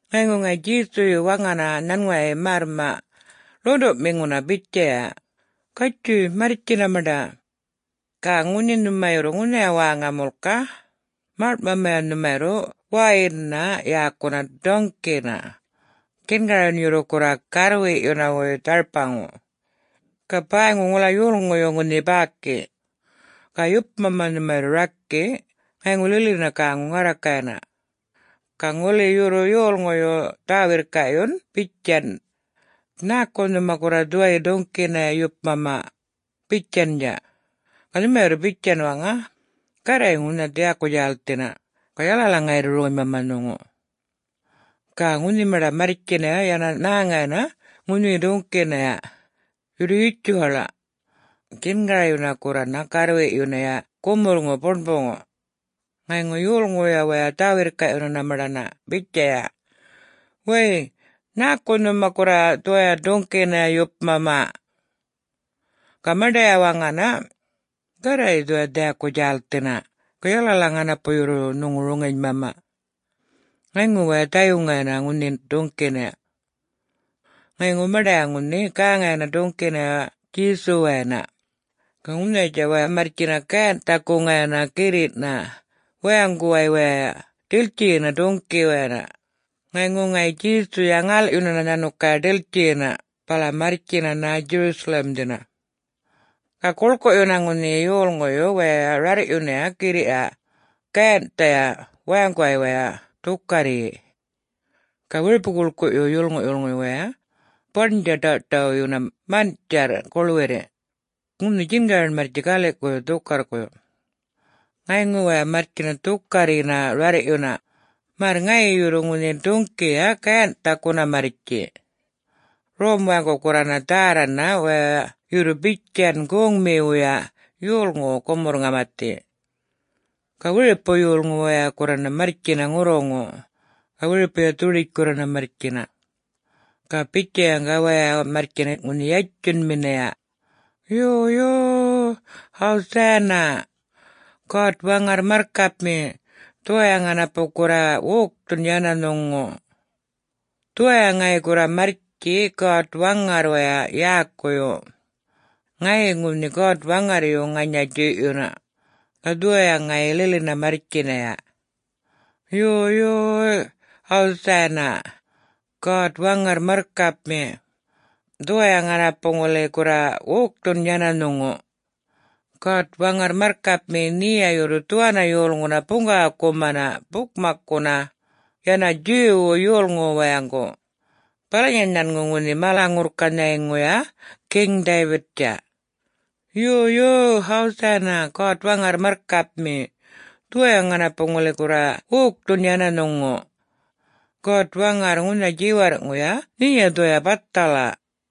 Ŋayŋu ŋayi Djesuyu waŋana nhanŋuway märrmaꞌ ḻuṉḏuꞌmiŋuna bitjaya, “Gatjuy marrtjina maṉḏa. Ga ŋunhi nhuma yurru ŋunhaya wäŋa mulka, maḻŋꞌmamaya nhuma yurru wäyinnha yäkuna duŋꞌkina djingaryun yurru gurra garrwiꞌyunawuy dharpaŋu. Ga bäyŋu ŋula yolŋuyu ŋunhi bäki. Ga yupmama nhuma yurru rakiꞌ, ŋayŋu lilina gäŋu ŋarrakayana. Ga ŋuli yurru yolŋuy dhä-wirrkaꞌyun bitjan, ‘Nhäku nhuma gurra dhuwayi duŋꞌkinaya yupmama?’ bitjandja, ga nhumaya yurru bitjan waŋa, ‘Garray ŋunha dhiyaku djälthina, ga yalala ŋayi yurru roŋinymama nhuŋu.’” Ga ŋunhi maṉḏa marrtjinaya yana nhäŋayana ŋunhi duŋꞌkinaya, yurru yutjuwaḻaꞌ, djingaryuna gurrana garrwiꞌyunaya gumurrŋu buṉbuŋu. Ŋayŋu yolŋuya wayay dhä-wirrkaꞌyunana maṉḏana bitjaya, “Way! Nhäku nhuma gurra dhuwayi duŋꞌkinaya yupmama?” Ga maṉḏaya waŋana, “Garray dhuwaya dhiyaku djälthina, ga yalala ŋanapu yurru nhuŋu roŋinymama.” Ŋayŋu waya dhayuŋayana ŋunhi duŋꞌkinaya. Ŋayŋu maṉḏaya ŋunhi gäŋayana duŋꞌkinaya Djesuwayana. Ga ŋunhayatja waya marrtjina gayanhꞌthakuŋaya girriꞌna wayaŋguway waya ḏiltjiyina duŋꞌkiwayana, ŋayŋu ŋayi Djesuya ŋalꞌyunana nhanukaya ḏiltjiyina bala marrtjina Jerusalem-dhina. Ga guḻkuꞌyuna ŋunhi yolŋuyu waya rarrꞌyuna girriꞌya gayanhꞌthaya wayaŋguway waya dhukarryi. Ga wiripu-guḻkuꞌyu yolŋuyu wayay baṉdja ḏaw-ṯawꞌyuna manꞌtjarr guḻwirri, ŋunhi djingaryun marrtji galiꞌkuyu dhukarrkuyu. Ŋayŋu waya marrtjina dhukarryina rarrꞌyuna märr ŋayi yurru ŋunhi ḏuŋꞌkiya gayanhꞌthakuna marrtji. Rom wayaŋgu gurrana dhärrana waya yurru bitjan goŋmiwuya yolŋuwu gumurr-ŋamathi. Ga wiripu yolŋu waya gurrana marrtjina ŋurruŋu, ga wiripuya dhuḏitj gurrana marrtjina. Ga bitjayaŋga waya marrtjina ŋunhi yatjunminaya, “Yo yo-o-oy! Hosanna! God-Waŋarr marrkapmi, dhuwaya ŋanapu gurra wokthun yana nhuŋu! Dhuwaya ŋayi gurra marrtji God-Waŋarrwaya yäkuyu. Ŋayi ŋunhi God-Waŋarryu ŋanya djuyꞌyuna, ga dhuwaya ŋayi lilina marrtjinaya. Yo, yo-o-oy! Hosanna! God-Waŋarr marrkapmi, dhuwaya ŋanapu ŋuli gurra wokthun yana nhuŋu! God-Waŋarr marrkapmi, nheya yurru dhuwanna yolŋuna buŋgawakumana bukmakkuna yana Jew-wu yolŋuwu wayaŋgu, balanya nhanŋu ŋunhi mala-ŋurrkanhayŋuya King David-tja. Yo, yo-o-oy! Hosanna! God-Waŋarr marrkapmi, dhuwaya ŋanapu ŋuli gurra wokthun yana nhuŋu! God-Waŋarr, ŋunha djiwarrꞌŋuya nheya dhuwaya bathala!”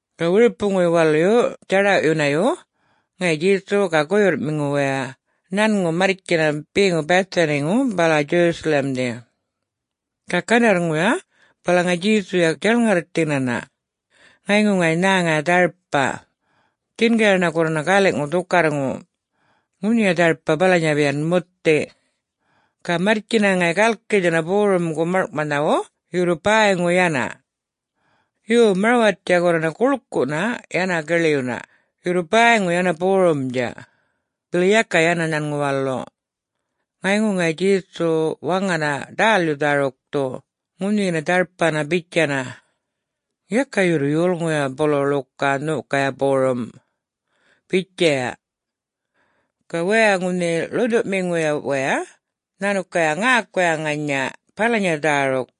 Ga wiripuyu waluyu djaḏawꞌyunayu ŋayi Djesu ga guyurrꞌmiŋu waya nhanŋu marrtjina beŋu Bethany-ŋu bala Jerusalem-dhi. Ga gandarrŋuya bala ŋayi Djesuya djaṉŋarrthinana. Ŋayŋu ŋayi nhäŋaya dharpa, djingaryuna gurrana galiꞌŋu dhukarrŋu. Ŋunhiya dharpa balanya bitjan muthi. Ga marrtjina ŋayi galkithina borumgu maḻŋꞌmanhawu yurru bäyŋu yana. Yo, marwattja gurrana guḻkuꞌna yana giḻyuna, yurru bäyŋu yana borumdja, bili yaka yana nhanŋu walu. Ŋayŋu ŋayi Djesu waŋana ḏälyu dhärukthu ŋunhiyi dharpana bitjana, “Yaka yurru yolŋuyu buluya ḻuka nhokaya borrum!” bitjaya. Ga waya ŋunhi ḻuṉḏuꞌmiŋuyuya wayay nhanukaya ŋäkuya ŋanya balanya dhäruk.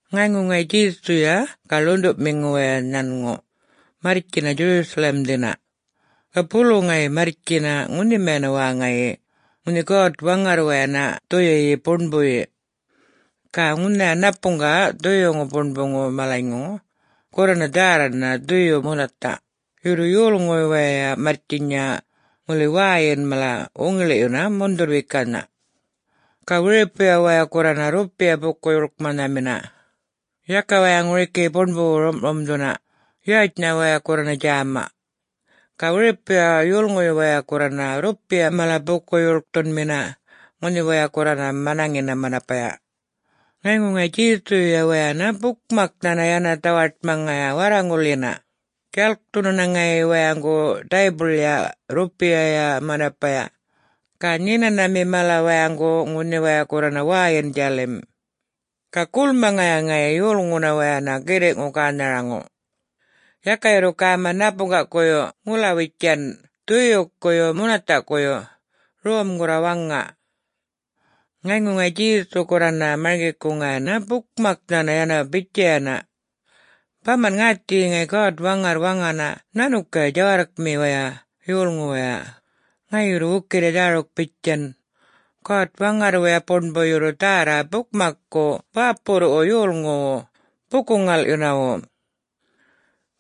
Ŋayŋu ŋayi Djesuya ga ḻuṉḏuꞌmiŋu waya nhanŋu marrtjina Jerusalem-dhina. Ga bulu ŋayi marrtjina ŋunhimana wäŋayi ŋunhi God-Waŋarrwayana Dhuyuyi Buṉbuyi. Ga ŋunhaya ṉapuŋga Dhuyuŋu Buṉbuŋu malanyŋu gurrana dhärrana dhuyu munathaꞌ, yurru yolŋuyu wayay marrtjinya ŋuli wäyin mala wuŋiḻiꞌyuna mundhurr-wekanha. Ga wiripuya waya gurrana rrupiya buku-yuḻkmanhamina. Yaka waya ŋunhi ŋuriki buṉbuwu rumꞌrumdhuna, yätjnha waya gurrana djäma. Ga wiripuya yolŋuyu wayay gurrana rrupiya mala buku-yuḻkthunmina ŋunhi waya gurrana manaŋina manapaya. Ŋayŋu ŋayi Djesuyuya wayana bukmaknhana yana dhawaṯmaŋaya warraŋulyina, djalkthunana ŋayi wayaŋgu daybuḻya, rrupiya manapaya, ga nhinanhami mala wayaŋgu ŋunhi waya gurrana wäyinꞌ djälim. Ga gulmaŋaya ŋayi yolŋuna wayana girriꞌŋu gänharaŋu: Yaka yurru gäma ṉapuŋgakuyu ŋulawitjan dhuyukuyu munathaꞌkuyu, rom gurra waŋa. Ŋayŋu ŋayi Djesuyuya gurrana marŋgikuŋayana bukmaknha yana bitjayana, “Bamanꞌ ŋäthiyi ŋayi God-Waŋarr waŋana nhanukaya djawarrkmiwaya yolŋuwaya ŋayi yurru wukirri dhäruk bitjan, ‘God-Waŋarrwuya Buṉbu yurru dhärra bukmakku bäpurruꞌwu yolŋuwu buku-ŋalꞌyunawu.’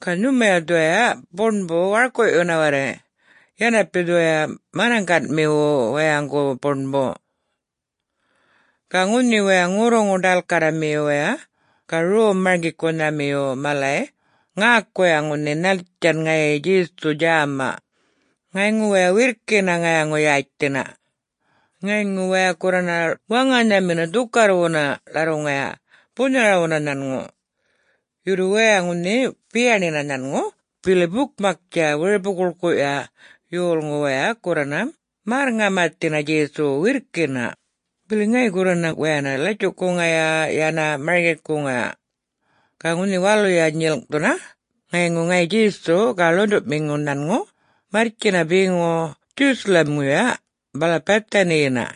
Ga nhumaya dhuwaya Buṉbuna warkuꞌyuna warray, yanapi dhuwaya manaŋganmiwu wayaŋgu buṉbu.” Ga ŋunhi waya ŋurruŋu-ḏalkarramiyu waya ga rom-marŋgikunhamiyu malay ŋäkuya ŋunhi nhättjan ŋayi Djesuyu djäma, ŋayŋu waya wirrkina ŋayaŋu-yätjthinaya. Ŋayŋu waya gurrana waŋanhamina dhukarrwuna ḻarruŋaya bunharawuna nhanŋu, yurru waya ŋunhi biyaṉiyina nhanŋu bili bukmaktja wiripu-guḻkuꞌya yolŋu waya gurrana märr-ŋamathina Djesuwu wirrkina, bili ŋayi gurrana wayana latjuꞌkuŋaya yana marŋgikuŋaya. Ga ŋunhi waluya nyilŋꞌthuna ŋayŋu ŋayi Djesu ga ḻuṉḏuꞌmiŋu nhanŋu marrtjinana beŋu Jerusalem-ŋuya bala Bethany-yina.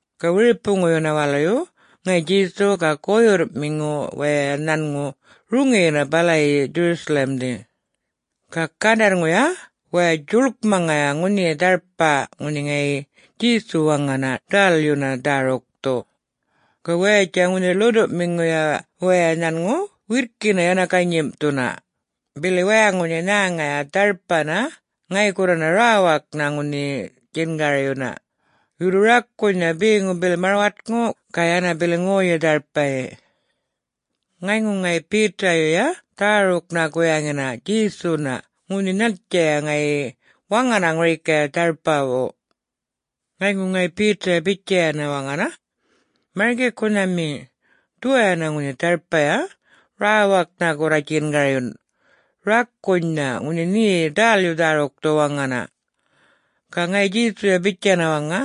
Ga wiripuŋuyuna waluyu ŋayi Djesu ga guyurrꞌmiŋu waya nhanŋu roŋiyina balayi Jerusalem-dhi. Ga gandarrŋuya waya djuḻkmaŋaya ŋunhiyi dharpa ŋunhi ŋayi Djesuya waŋana ḏälyuna dhärukthu. Ga wayatja ŋunhi ḻuṉḏuꞌmiŋuya waya nhanŋu wirrkina yana ganyimꞌthuna, bili waya ŋunhi nhäŋaya dharpana ŋayi gurrana räwaknha ŋunhi djingaryuna, yurru rakunynha, beŋu bili marwatŋu ga yana bili ŋoyyi dharpayi. Ŋayŋu ŋayi Peter-yuya dhäruknha guyaŋina Djesuna ŋunhi nhattjaya ŋayi waŋana ŋuriki dharpawu. Ŋayŋu ŋayi Peter-ya bitjayana waŋana, “Marŋgikunhami, dhuwayana ŋunhi dharpaya rawaknha gurra djingaryun, rakunynha, ŋunhi nhe ḏälyu dhärukthu waŋana!” Ga ŋayi Djesuya bitjana waŋa,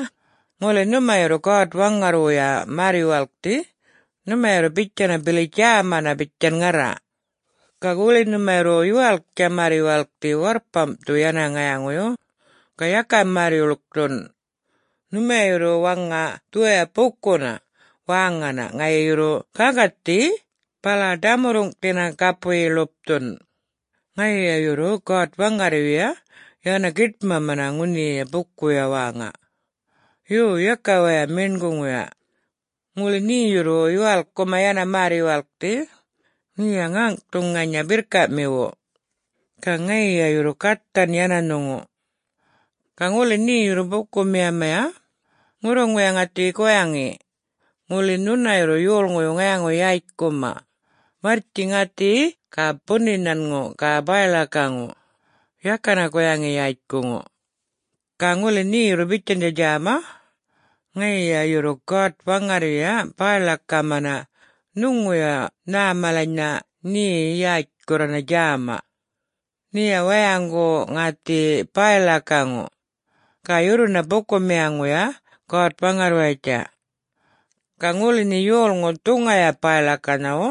“Ŋuli nhuma yurru God-Waŋarrwuya märr-yuwalkthi, nhumaya yurru bitjana bili djämana bitjan ŋarra. Ga ŋuli nhuma yurru yuwalktja märr-yuwalkthi warrpamdhu yana ŋayaŋuyu, ga yaka märr-yuḻkthun, nhumaya yurru waŋa dhuwaya bukuna wäŋana ŋayi yurru gaŋgathi bala ḏamurruŋdhina gapuyi ḻupthun. Ŋayiya yurru God-Waŋarryuya yana giṯmamana ŋunhiya bukuya wäŋa. Yo, yaka waya meṉguŋuya. Ŋuli nhe yurru yuwalkkumaya yana märr-yuwalkthi, nheya ŋäŋꞌthu ŋanya birrkaꞌmiwu, ga ŋayiya yurru gathan yana nhuŋu. Ga ŋuli nhe yurru bukumiyamaya, ŋurruŋuya ŋäthiyi guyaŋi: Ŋuli nhuna yurru yolŋuyu ŋayaŋu-yätjkuma, marrtji ŋäthiyi ga buni nhanŋu ga bäy-ḻakaŋu, yakana guyaŋi yätjkuŋu. Ga ŋuli nhe yurru bitjandja djäma, ŋayiya yurru God-Waŋarryuya bäy-ḻakamana nhuŋuya nhä malanynha nhe yätj gurrana djäma. Nheya wayaŋgu ŋäthiyi bäy-ḻakaŋu, ga yurruna bukumiyaŋuya God-Waŋarrwayatja. [Ga ŋuli nhe yolŋu dhuŋaya bäy-ḻakanhawu,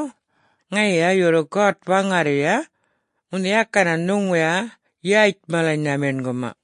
ŋayiya yurru God-Waŋarryuya ŋunhi yakana nhuŋuya yätj malanynha meṉguma.]”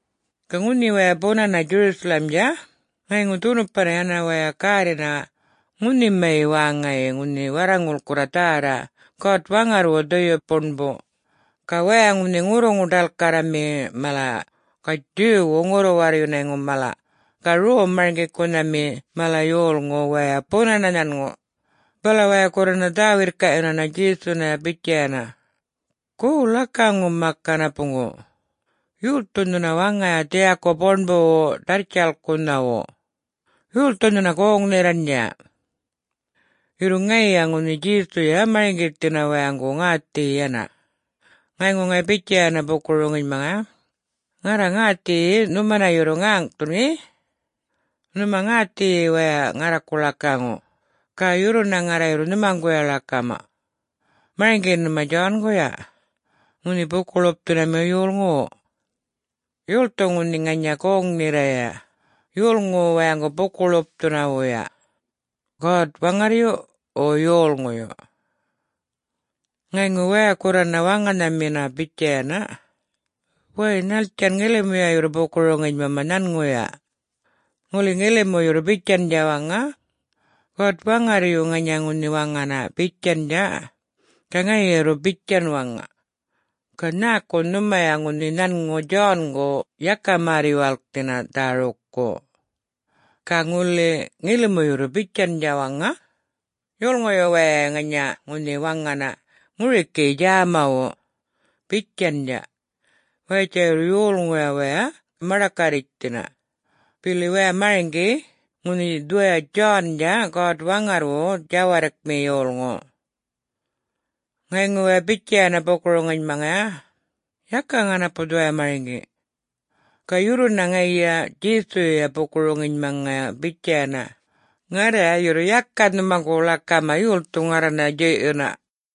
Ga ŋunhi waya bunana Jerusalem-dja ŋayŋu dhunupana yana waya gärrina ŋunhima wäŋayi ŋunhi warraŋul gurra dhärra God-Waŋarrwu Dhuyu Buṉbu. Ga waya ŋunhi ŋurruŋu-ḏalkarrami mala ga Jew-wu ŋurru-warryunayŋu mala ga rom-marŋgikunhami mala yolŋu waya bunana nhanŋu, bala waya gurrana dhä-wirrkaꞌyunana Djesunaya bitjayana, “Go, ḻakaŋu mak ŋanapuŋgu, yolthu nhuna waŋaya dhiyaku buṉbuwu ḏarrtjalkunhawu? Yolthu nhuna goŋ-nherraṉdja?” Yurru ŋayiya ŋunhi Djesuya marŋgithina wayaŋgu ŋäthiyi yana. Ŋayŋu ŋayi bitjayana buku-roŋinymaŋaya, “Ŋarra ŋäthiyi nhumana yurru ŋäŋꞌthun ŋeꞌ. Nhuma ŋäthiyi waya ŋarraku ḻakaŋu, ga yurruna ŋarraya yurru nhumaŋguya ḻakama. Marŋgi nhuma John-guya, ŋunhi Buku-ḻupthunamiwuya yolŋuwu? Yolthu ŋunhi ŋanya goŋ-nherraya yolŋuwu wayaŋgu buku-ḻupthunawuya? God-Waŋarryu, wo yolŋuyu?” Ŋayŋu waya gurrana waŋanhamina bitjayana, “Way, nhattjan ŋilimuya yurru buku-roŋinymama nhanŋuya? Ŋuli ŋilimu yurru bitjandja waŋa, ‘God-Waŋarryu ŋanya ŋunhi waŋana,’ bitjandja, ga ŋayiya yurru bitjan waŋa, ‘Ga nhäku nhumaya ŋunhi nhanŋu John-gu yaka märr-yuwalkthina dhärukku?’ Ga ŋuli ŋilimu yurru bitjandja waŋa, ‘Yolŋuyu wayay ŋanya ŋunhi waŋana ŋuriki djämawu,’ bitjandja, wayatja yurru yolŋuya waya maḏakarritjthina, bili waya marŋgi ŋunhi dhuwaya John-dja God-Waŋarrwu djawarrkmi yolŋu.” Ŋayŋu waya bitjayana buku-roŋinymaŋaya, “Yaka ŋanapu dhuwaya marŋgi!” Ga yurruna ŋayiya Djesuya buku-roŋinymaŋaya bitjayana, “Ŋarraya yurru yaka nhumaŋguya ḻakama yolthu ŋarranaya djuyꞌyuna.”